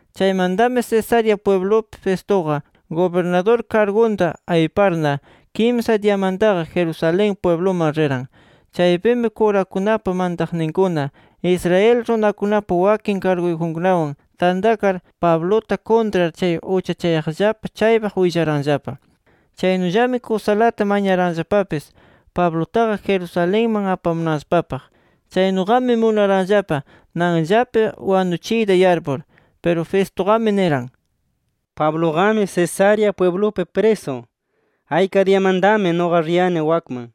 Chaymantami, Cesarea pwiblupi Festuqa gubirnadur kargunta ayparna, kimsa diyamantaqa Jerusalén pwibluman riran. Chaypimi, kurakunapa mantaqninkuna, Israel runakunapa wakin karguyjunkunawan tantakar, Pabluta kuntrar chay uchachayaqllapa chaypaq willaranllapa. Chaynullami kusalata mañaranllapapis Pablutaqa, Jerusalenman apamunanllapapaq. Chaynuqami munaranllapa nanllapi wanuchiyta yarpur. Piru Festuqami niran: —Pabluqami Cesarea pwiblupi prisu. Ayka diyamantami nuqa riyani wakman.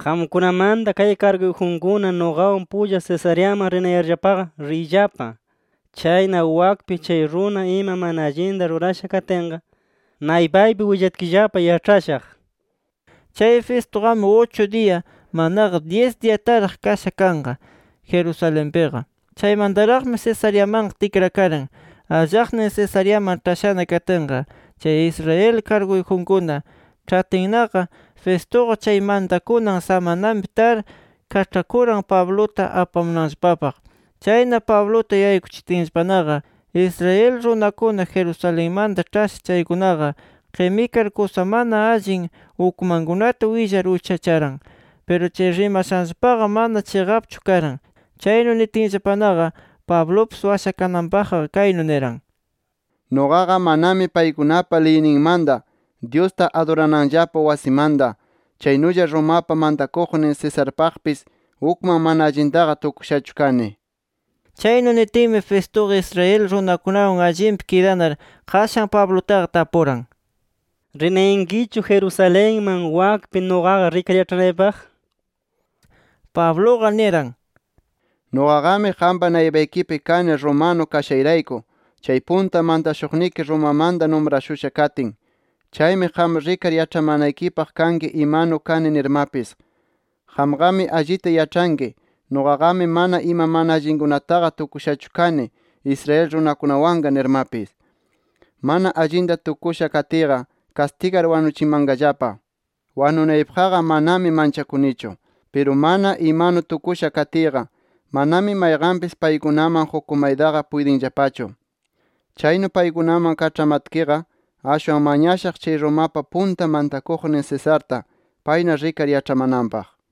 Qamkunamanta kay karguyjunkuna nuqawan pulla Cesareaman rinayarllapaqa riyllapa. Chayna wakpi chay runa ima mana allinta rurasha katinqa, naypaypi willatkillapa yaĉhashaq nir. Chay Festuqami, uchu diya manaqa dyis diyataraq kasha kanqa Jerusalenpiqa. Chaymantaraqmi Cesareamanqa tikrakaran. Allaqnin Cesareaman ĉhashana katinqa, chay Israel karguyjunkuna ĉhatinnaqa, Festuqa chay mantakunan samananpi tar kaĉhakuran Pabluta apamunanllapapaq. Chayna Pabluta yaykuchitinllapanaqa, Israel runakuna Jerusalenmanta ĉhasha chaykunaqa qimikar, kusa mana allin ukmankunata willar uchacharan. Piru chay rimashanllapaqa, mana chiqapchu karan. Chaynu nitinllapanaqa Pablupis washakananpaqqa, kaynu niran: —Nuqaqa manami paykunapa liyninmanta, Dyusta adurananllapa wasimanta, chaynulla Romapa mantakuqnin Cesarpaqpis ukman mana allintaqa tukushachu kani nir. Chaynu nitinmi, Festuqa Israel runakunawan allinpi kidanar qashan Pablutaqa tapuran: —¿Rinayankichu Jerusalenman, wakpi nuqaqa rikar yaĉhanaypaq? Pabluqa niran: —Nuqaqami qampa naypaykipi kani romano kashayrayku chay punta mantashuqniki Romamanta numrashusha katin. Chaymi qam rikar yaĉhamanaykipaq kanki imanu kani nirmapis. Qamqami allita yaĉhanki, nuqaqami mana ima mana allinkunataqa tukushachu kani, Israel runakunawanqa nirmapis. Mana allinta tukusha katiyqa, kastigar wanuchimanqallapa. Wanunaypaqqa manami manchakunichu. Piru mana imanu tukusha katiyqa, manami mayqanpis paykunaman qukumaytaqa puytinllapachu. Chaynu paykunaman kaĉhamanatkiqa, ashwan mañashaq chay Romapa punta mantakuqnin Cesarta, payna rikar yaĉhamananpaq nir.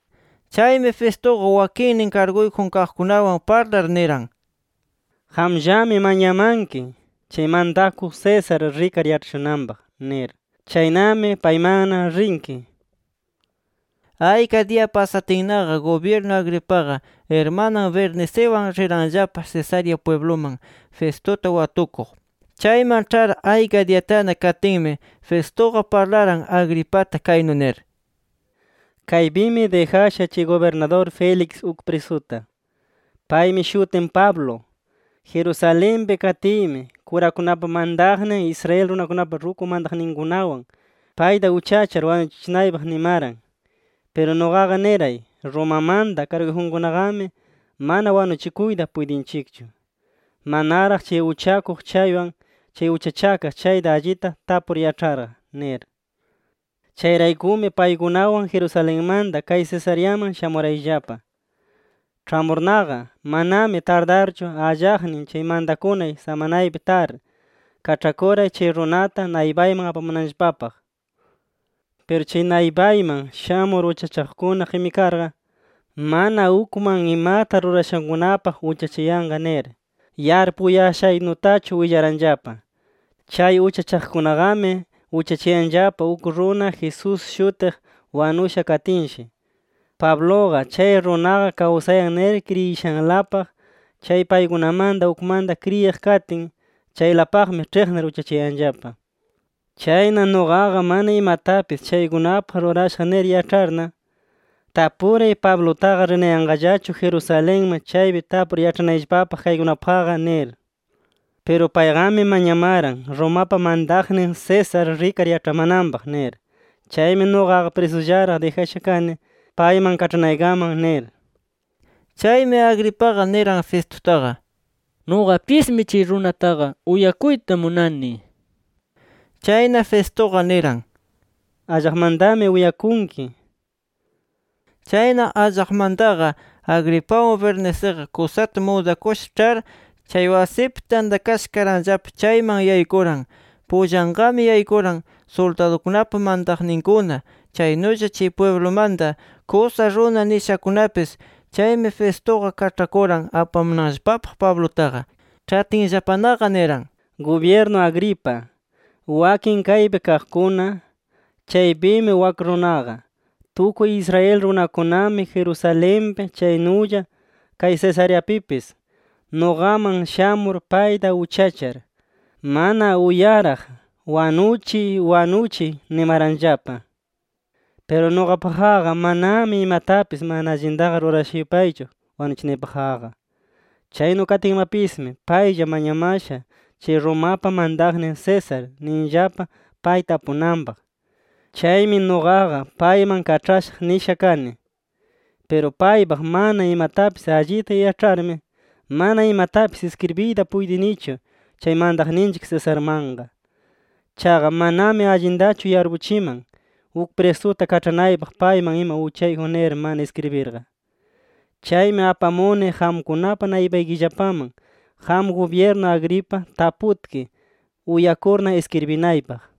Chaymi Festuqa wakinnin karguyjun kaqkunawan parlar niran: —Qamllami mañamanki, chay mantakuq César rikar yaĉhashunanpaq nir. Chaynami paymanna rinki nir. Ayka diya pasatinnaqa, gubyirnu Agripaqa irmanan Berniciwan riranllapa Cesarea pwibluman Festuta watukuq. Chayman ĉhar ayka diyatana katinmi, Festuqa parlaran Agripata kaynu nir: —Kaypimi dijasha chay gubirnadur Félix uk prisuta. Paymi shutin Pablo. Jerusalenpi katiymi, kurakunapa mantaqnin, Israel runakunapa ruku mantakuqninkunawan payta uchachar wanuchichinaypaq nimaran. Piru nuqaqa niray: ‘Romamanta karguyjunkunaqami mana wanuchikuyta puytinchikchu, manaraq chay uchachakuq chaywan, chay uchachakaq chayta allita tapur yaĉharqa’ nir. Chayraykumi paykunawan Jerusalenmanta kay Cesareaman shamurayllapa. Ĉhamurnaqa, manami tardarchu allaqnin chay mantakunay samanaypi tar, kaĉhakuray chay runata naypayman apamunanllapapaq. Piru chay naypayman shamur uchachaqkuna qimikarqa, mana ukman imata rurashankunapaq uchachayanqa nir yarpuyashaynutachu willaranllapa. Chay uchachaqkunaqami, uchachayanllapa uk runa, Jesús shutiq wanusha katinshi, Pabluqa chay runaqa kawsayan nir kriyishanlapaq. Chay paykunamanta ukmanta kriyiq katin, chaylapaqmi ĉhiqnir uchachayanllapa. Chayna nuqaqa mana imatapis chaykunapaq rurashaq nir yaĉharna, tapuray Pablutaqa rinayanqallachu Jerusalenman chaypi tapur yaĉhanayllapapaq kaykunapaqqa nir. Piru payqami mañamaran: ‘Romapa mantaqnin César rikar yaĉhamananpaq’ nir. Chaymi nuqaqa prisullaraq dijasha kani, payman kaĉhanaykaman nir. Chaymi Agripaqa niran Festutaqa: —Nuqapismi chay runataqa uyakuyta munani nir. Chayna Festuqa niran: —Allaqmantami uyakunki nir. Chayna allaqmantaqa Agripawan Berniciqa kusata mudakusha ĉhar, chay wasipi tantakasha karanllapa chayman yaykuran. Pullanqami yaykuran suldadukunapa mantaqninkuna, chaynulla chay pwiblumanta kusa runa nishakunapis. Chaymi Festuqa kaĉhakuran apamunanllapapaq Pablutaqa. Ĉhachitinllapanaqa niran: —Gubyirnu Agripa, wakin kaypi kaqkuna, chaypimi wak runaqa. Tukuy Israel runakunami Jerusalenpi chaynulla kay Cesareapipis, nuqaman shamur payta uchachar, mana uyaraq ‘¡Wanuchiy, wanuchiy!’ nimaranllapa. Piru nuqapaqqa manami imatapis mana allintaqa rurasha yupaychu wanuchinapaqqa. Chaynu katinmapismi paylla mañamasha, chay Romapa mantaqnin César ninllapa pay tapunanpaq. Chaymi nuqaqa payman kaĉhashaq nisha kani. Piru paypaq mana imatapis allita yaĉharmi, mana imatapis iskribiyta puytinichu chay mantaqninchik Cesarmanqa. Chaqa manami allintachu yarpuchiman, uk prisuta kaĉhanaypaq payman ima uchayjun nir mana iskribirqa. Chaymi apamuni qamkunapa naypaykillapaman qam gubyirnu Agripa taputki, uyakurna iskribinaypaq.